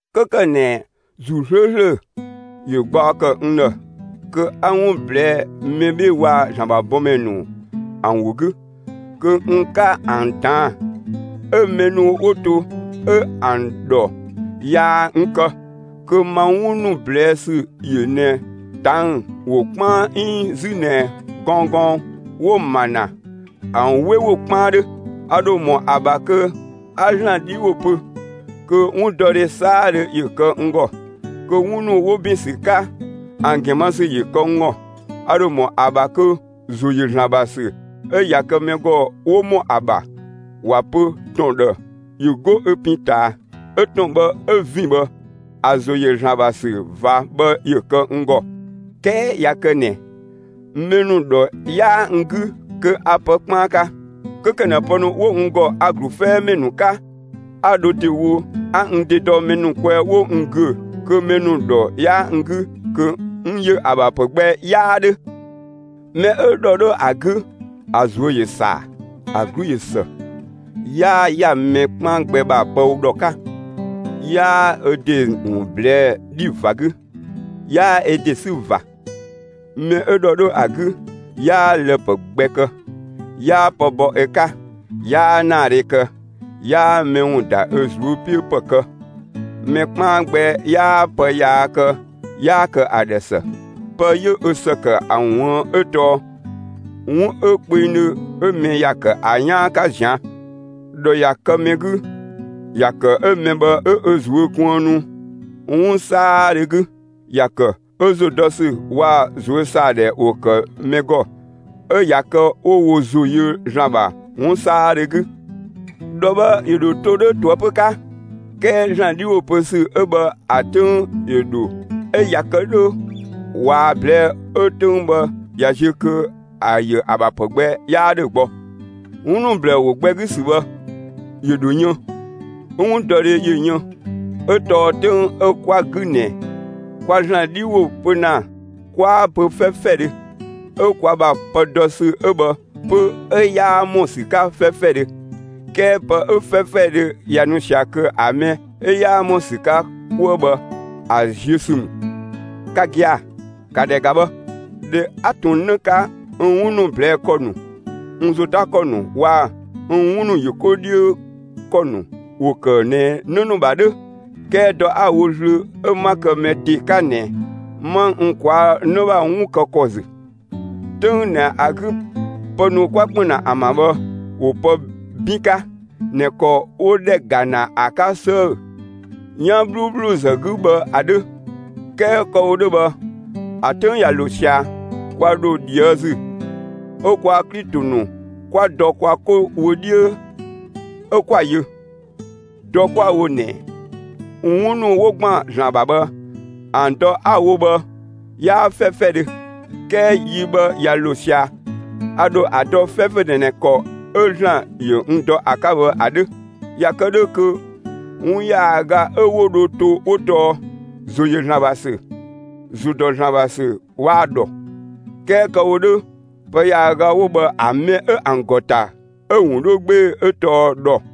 'Kö ‑kë ꞊nɛ ‑Zuu 'slööslö ‑yö gbaɔ ‑kë n ‑dhë kö 'a 'wun ꞊blɛɛ'‑ mɛ 'bhee‑ waa‑ ‑Zlan ‑bha bɔmɛ ‑nu ‑an ‑wo 'gü, kö n 'ka ‑an ꞊daan', 'ö mɛ ‑nu 'wo to 'ö ‑an ‑dhɔ 'yaa n kë, kö ma 'wun ‑nu ꞊blɛɛ' ‑sü ‑yö ꞊nɛ ꞊tang'‑ ‑wo 'kpaan 'iin 'zü ꞊nɛ gɔnggɔng 'wo‑ ‑ma ‑na, ‑an 'we ‑wo 'kpaan 'dhö. A ‑dho ‑mɔ ‑a ‑bha kö 'a ‑Zlan 'dhi ‑wo pö, kö 'wundɔdhe 'saadhö ‑yö kë n ‑gɔ, kö 'wun ‑nu 'wo ‑bin ‑sü 'ka, ‑an ‑gɛn ma ‑sü ‑yö kë n ‑gɔ. A ‑dho ‑mɔ ‑a ‑bha kö ‑zo ‑yö ‑Zlan ‑bha ‑sü 'ö ꞊ya kë mɛ ‑gɔ 'wo ‑mɔ ‑a ‑bha ‑wa pö ‑tɔn ‑dhë ‑yö 'go ö pin ꞊taa, 'ö ‑tɔn bhë 'ö ‑vin bhë, ‑a ‑zo ‑yö ‑Zlan ‑bha ‑sü ꞊va bhë ‑yö kë n ‑gɔ; 'kɛɛ ꞊ya kë ꞊nɛ mɛ ‑nu ‑dhɔ 'yaa n 'gü, kö a pë 'kpaan 'ka. 'Kö ‑kë ꞊nɛ pë ‑nu 'wo n ‑gɔ, a‑ ‑glu 'fɛɛmɛ ‑nu 'ka, 'a dho ‑dewo 'a n ‑de dɔ mɛ ‑nu kwɛɛ 'wo n ‑güö, kö mɛ ‑nu ‑dhɔ 'yaa n 'gü, kö n ‑yö ‑a ‑bha ‑pë gbɛ 'yaa ‑dhö. Mɛ 'ö ‑dhɔ 'dhö ‑a 'gü, ‑a ꞊zuö' ‑yö ‑saa; ‑a 'glu ꞊yö ‑së; 'yaa ‑ya mɛ 'kpaan gbɛ ‑bha pë ‑dhɔ 'ka; 'yaa ö ‑de ‑wun ꞊blɛɛ'‑ 'dhi ꞊va 'gü; 'yaa ö ‑de 'sü ꞊va. Mɛ 'ö ‑dhɔ 'dhö ‑a 'gü, 'yaa lë‑ ‑pë gbɛ kë; 'yaa pë bɔ ö 'ka; 'yaa ‑naadhe kë, 'yaa mɛ ‑wun ‑da ö ꞊zuö' 'piö ‑pë kë. Mɛ 'kpaan gbɛ 'yaa pë yaa kë 'yaa kë ‑a ‑dhë ‑së; pë 'yö ö ‑së ‑kë ‑a ꞊wuën' 'ö tɔɔ 'wun 'ö kpengdhö 'ö mɛ ‑ya ‑kë ‑a 'yaan 'ka ꞊zian'. ‑Dhɔ ꞊ya kë mɛ 'gü, ‑ya ‑kë 'ö mɛ bhë 'ö ö ꞊zuö' kuënnu 'wun 'saadhö 'gü; ‑ya ‑kë 'ö ‑zo dɔ ‑sü waa‑ ꞊zuösaadhɛ ‑wo kë mɛ ‑gɔ 'ö ꞊ya kë 'wo wo ‑zo yö ‑Zlan ‑bha 'wun 'saadhö 'gü. ‑Dhɔ bhë ‑yö ‑dho to 'dhö ꞊toëpö 'ka. 'Kɛɛ ‑Zlan 'dhi ‑wo pö ‑sü 'ö bhë ‑a 'töng ‑yö ‑dhö 'ö ꞊ya kë 'dhö ꞊waa‑ ꞊blɛɛ'‑ 'ö‑ 'töng bhë ꞊ya ziö kö ‑a ‑yö ‑a ‑bha ‑pë gbɛ 'yaa 'dhö gbɔ. 'Wun ‑nu ‑blɛɛ ‑wo gbɛ 'gü ‑sü bhë ‑yö ‑dho yën, 'ö 'wundɔdhe ‑yö yën. 'Ö tɔɔ 'töng 'ö 'kwa‑ 'gü ꞊nɛ, kwa ‑Zlan 'dhi ‑wo pö ‑na, 'kwaa‑ pö 'fɛfɛdhö, 'ö kwa ‑bha pë dɔ ‑sü 'ö bhë 'pö 'ö 'yaa ‑mɔ ‑sü 'ka 'fɛfɛdhö. 'Kɛɛ pë 'ö 'fɛfɛdhö ꞊ya nu ꞊sia kö ‑a mɛ 'ö 'yaa ‑mɔ ‑sü 'ka 'kuë bhë ‑a ziö ‑sü ‑mü. Ka gia‑, ‑ka ‑dhɛ ‑ga bhë! ꞊Dhɛ 'a ꞊tun 'në 'ka, n 'wun ‑nu ꞊blɛɛ' ‑kɔ ‑nu, n ‑zo 'ta ‑kɔ ‑nu waa‑ n 'wun ‑nu ‑yö 'ko 'dhiö ‑kɔ ‑nu ‑wo ‑kë ꞊nɛ 'në ‑nu ‑bha 'dhö. 'Kɛɛ dɔ 'a‑ wo zlöö 'ö 'ma kë mɛ ‑de 'ka ꞊nɛ, 'ma n ꞊kwaa' 'në ‑bha 'wun kë ‑kɔ ‑zü. 'Töng ꞊nɛ ‑a 'gü pë ‑nu 'kwa ‑kpën ‑na ‑an ‑bha bhë ‑wo pë 'bin 'ka ꞊nɛ ‑kɔ 'wo ‑dhɛ ‑ga ‑na ‑a 'ka 'sëë‑ 'yan 'bhluubhluzë 'gü bhë ‑a 'dhö. 'Kɛɛ kë‑ wo 'dhö bhë, ‑a 'töng ꞊ya ‑lo ꞊sia, (kwa ‑dho ꞊dhië' ‑zü) 'ö kwaa‑ Klito ‑nu 'kwa dɔ kwa 'ko wö 'dhiö 'ö 'kwa‑ yö. Dɔ 'kwa‑ wo ꞊nɛ 'wun ‑nu 'wo ‑gban ‑Zlan ‑bha bhë ‑an dɔ 'a‑ wo bhë 'yaa 'fɛfɛdhö. 'Kɛɛ yi bhë ꞊ya ‑lo ꞊sia, a ‑dho ‑a dɔ 'fɛfɛdhö ꞊nɛ ‑kɔ 'ö ‑Zlan ‑yö n dɔ ‑a 'ka bhë ‑a 'dhö. ꞊Ya kë 'dhö kö 'wun ‑yaaga 'ö 'wo dho to 'wo tɔɔ: ‑Zo ‑yö ‑Zlan ‑bha ‑sü, ‑zo ‑dɔ ‑Zlan ‑bha ‑sü waa‑ ‑dhɔ. 'Kɛɛ kë‑ wo 'dhö, pë ‑yaaga 'wo bhë, ‑a mɛ 'ö ‑an ‑gɔ ‑ta 'ö‑ ‑wun 'dhö 'gbee‑ 'ö tɔɔ ‑dhɔ.